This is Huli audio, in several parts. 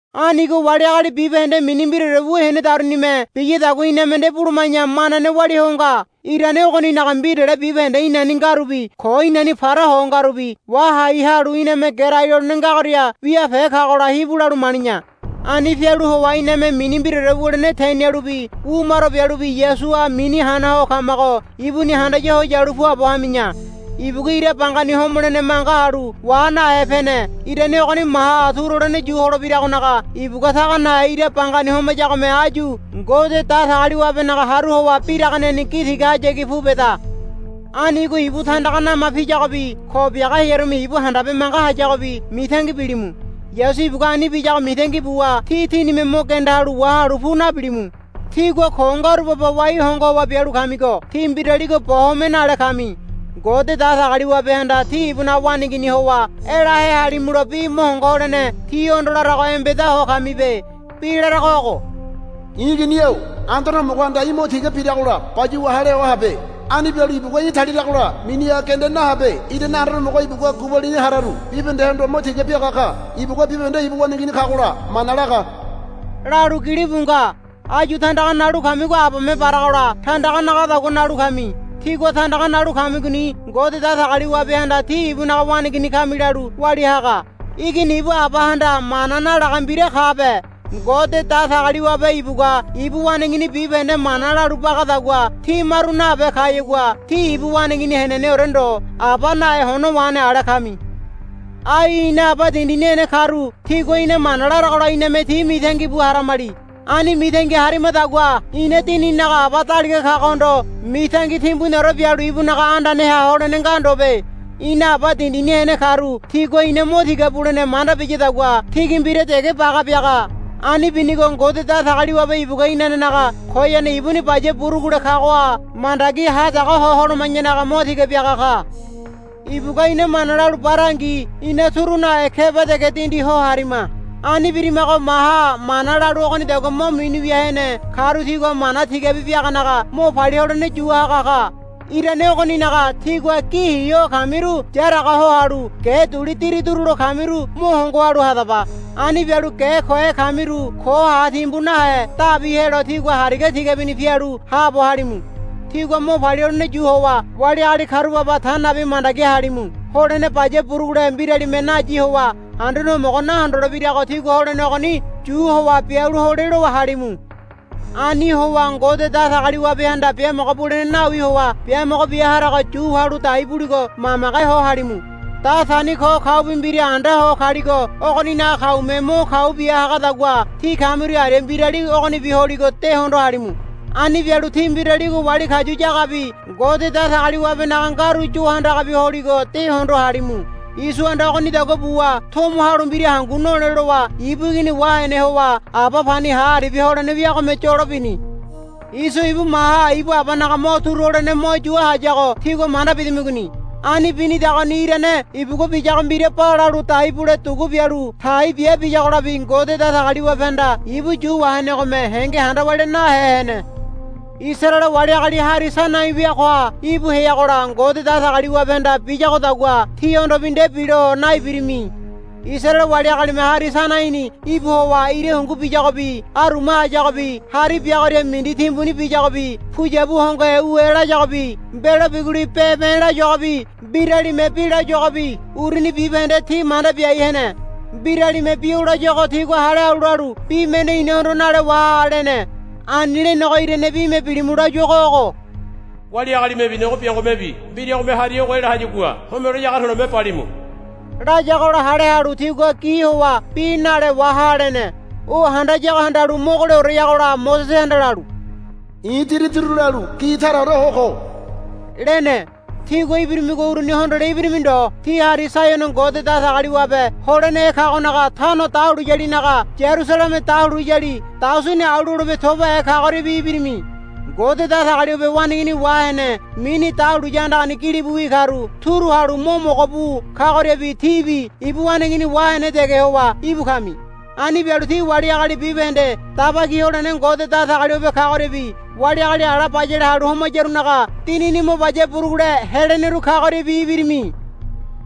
Anigo wali agali bibahende mini mbiraore wu henedarunime biyadagua iname nde buluma̱ya manane walia ho nga. Irane ogoninaga mbirale bibahende inani ngarubi ko inani para ho ngarubi wahai halu iname gerai lolene ngagoria wiape kagola hibu lalu mali̱ya. Ani pialu howa iname mini mbiraore wulene tenialubi wu maro bialubi Yasuha mini hana ho kamago ibuni handaya ho yalu puabo hami̱ya. Ibugua ira bangani homolene manga halu wa nahe pene. Irane ogoni maha turu holene yu holebiragonaga ibugua taga nahe ira bangani homayagome áyu Ngode Datagaliwabenaga haru howa biraganeni gi tigahayagi pu beda. Anigo ibu tandaga nama piyagobi ko biaga hearume ibu handabe manga hayagobi mitangi bilimu. Yasu ibugua ani biyago mitangi buwa tí tínime mo genda halu wahalu pu nabilimu. Tígua ko ngaru baba wai hongo howa bialu kamigo tí mbiraligo bo home nale kami. Ngode Datagaliwabehanda tí ibunaga waneigini howa elahe halimulo bi mo hongo holene tíhondo larago embeda ho kamibe. Bi larago ogo, I̱ igini-o Anduane Homogohanda í̠ mo tiga biragola bayuwa hale ho habe. Ani bialu ibugua í̠ taliragola miniha genda nahabe. Irane Anduane Homogo ibugua gubalini hararu bibahendehondo mo tiga biaga ka. Ibugua bibahende ibu waneigini kagola mana laga, lalu gilibu nga. Áyu tandaga nalu kamigo abame baragola tandaga nagadagua nalu kami. Tígua tandaga nalu kamigoni Ngode Datagaliwabehanda tí ibunaga waneigini kami lalu walia haga. Igini ibu abahanda mana nalaga mbira kabe. Ngode Datagaliwabe ibugua ibu waneigini bibahende mana lalu bagadagua tí maru nabe kayagua tí ibu waneigini heneneore ndo aba nahe hono wahene ale kami. Ai ina aba dindini hene karu tigua ina mana laragola iname ti mitangi bu haramali. Ani mitangi harimadagua ina dinininaga Aba daliga kagohondo mitangi timbuniore bialu ibunaga andaneha holene nga ndobe. Ina aba dindini hene karu tigua ina mo tiga bulene manda biyadagua tigi mbira dege baga biaga. Ani binigo Ngode Datagaliwabe ibugua inanenaga koyane ibuni baya burugule kagoha mandagi ha tago ho holoma̱yanaga mo tiga biaga ka. Ibugua ina mana lalu barangi ina turu nahe keba dege dindi ho harima. Ani birimago maha mana lalu ogonidagua mo mini wia hene karu tigua mana tigabi biaganaga mo palia holene yu haga ka. Irane ogoninaga tígua gi hi ho kamiru yaraga ho halu ge duli diri durulo kamiru mo hongo halu hadaba. Ani bialu ge kohe kamiru ko ha timbu nahe dabi helo tígua hariga tigabini pialu haabo halimu. Tigua mo palia holene yu howa wali agali karu baba ta nabi mandagi halimu. Holene baya burugule mbiralime nayi howa Anduane Homogo nahondolebirago tígua holene ogoni yu howa bialu hole lowa halimu. Ani howa Ngode Datagaliwabehanda biamogo bulene nawi howa biamogo bia harago yu wahalu dai buligo mamage ho halimu. Datani ko kaubi mbira anda ho kaligo ogoninaga kaume mo kau bia hagadagua tí kamiru aria mbirali ogonibi holigo de hondo halimu. Ani bialu tí mbiraligo wali kayu yagabi Ngode Datagaliwabenaga ngaru yo handagabi holigo de hondo halimu. Isohanda ogonidagua buwa tomo halu mbira hangu nole lowa ibu igini wahene howa aba pani ha aribia holene wiagome yolo bini. Iso ibu maha ibu abanaga mo turu holene mo yua hayago tígua manda bidamigoni. Ani binidagoni irane ibugua biyago mbira balalu dai bule dugu bialu tai bia biyagolabi Ngode Datagaliwabehanda ibu yu wahenegome henge handa walia nahe hene. Isaraele wali agali Hari Sainai weagoha íbu heagola Ngode Datagaliwabehanda biyagodagua tíhondobi nde bilo naibirimi. Isaraele wali agalime Hari Sainaini íbu howa ira hungu biyagobi aruma hayagobi hari biagoria mindi timbuni biyagobi puyabu hongohe u e layagobi mbelo biguli be̱be̱ layuagobi mbiralime bi layuagobi uruni bibahende ti manda biai hene. Mbiralime bi o layuago tigua hale halu lalu, Bi mende inahondo nale waha, lene. Ani lenego irane bime bilimu layuago ogo, Wali agalimebi nogo biangomebi mbiragome hari ogo ela hayagua homelo ege to̱le̱me balimu, layagola hale halu tigua gi howa, Bi nale waha, lene. O handayago handalu mogoleoreyagola Mosesehanda lalu, I̱ diri durulalu gi taraore ho ko, lene. Tígua ibirimigo uruni hondole ibirimi ndo. Tí Hari Saiono Ngode Datagaliwabe holenehe kagonaga tano dahuliyanaga Yarusaleme dahuliyali daosini au lolebe tobahe kagoriabi ibirimi. Ngode Datagaliwabe waneigini wahene mini dahuliya andagani gilibuwi karu turu halu mo mogo bu kagoriabi tíbi ibu waneigini wahene dege howa íbu kami. Ani bialu tí wali agali bibahende daba ki holene Ngode Datagaliwabe kagoriabi wali agali ala bayale halu homayarunaga dinini mo baya burugule heleneru kagoriabi ibirimi.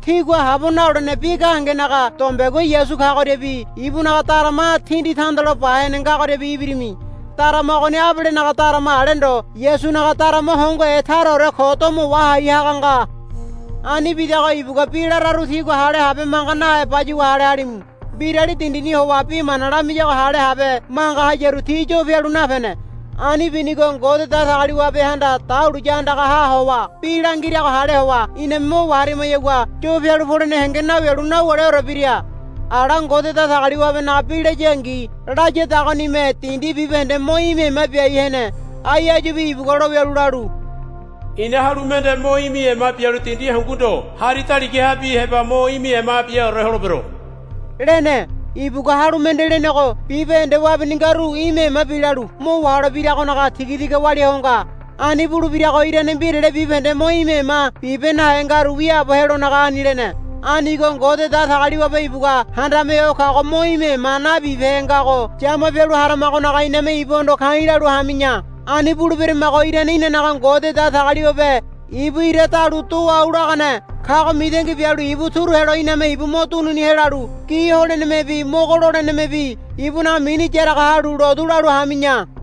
Tígua habo nalolene bi gahengenaga dombegua Yasu kagoriabi ibunaga darama tindi tandalo ba hene ngagoriabi ibirimi. Darama ogoni Abelenaga darama ale ndo Yasunaga darama hongohe taraore ko domo wahai haga nga. Ani bidago ibugua bi lararu tígua hale habe manga nahe bayuwa hale halimu. Mbirali dindini howa bi mana lamiyago hale habe manga hayaru ti yo pialu napene. Ani binigo Ngode Datagaliwabehanda dahuliya andagaha howa bi langirago hale howa iname mo waharimayagua yo pialu polene henge nawialu nawuleore bira. Ala Ngode Datagaliwabenaga bi layangi layadagonime dindi bibahende mo imi ema biai hene. Ai áyubi ibugua lowialu lalu, I̱na halu mende mo imi ema bialu dindi hangu ndo hari daligahabi heba mo imi ema biaore holebero, lene. Ibugua, Halu mende, lenego bibahende wabini ngaru imi ema bilalu mo waholebiragonaga tigatiga walia ho nga. Ani bulebirago irane mbirale bibahende mo imi ema bibe nahe ngaru wiaabo helonaga ani lene. Anigo Ngode Datagaliwabe ibugua Handame Ho Kago mo imi ema nabibehe ngago yama pialu haramagonaga iname ibuhondo ka̱i̱ lalu hami̱ya. Ani buleberamago irane inanaga Ngode Datagaliwabe ibu ira dalu do au lagane kago mitangi bialu ibu turu helo iname ibu mo dunini helalu gi holenemebi mogo lolenemebi ibunaga mini yaraga halu lotu lalu hami̱ya.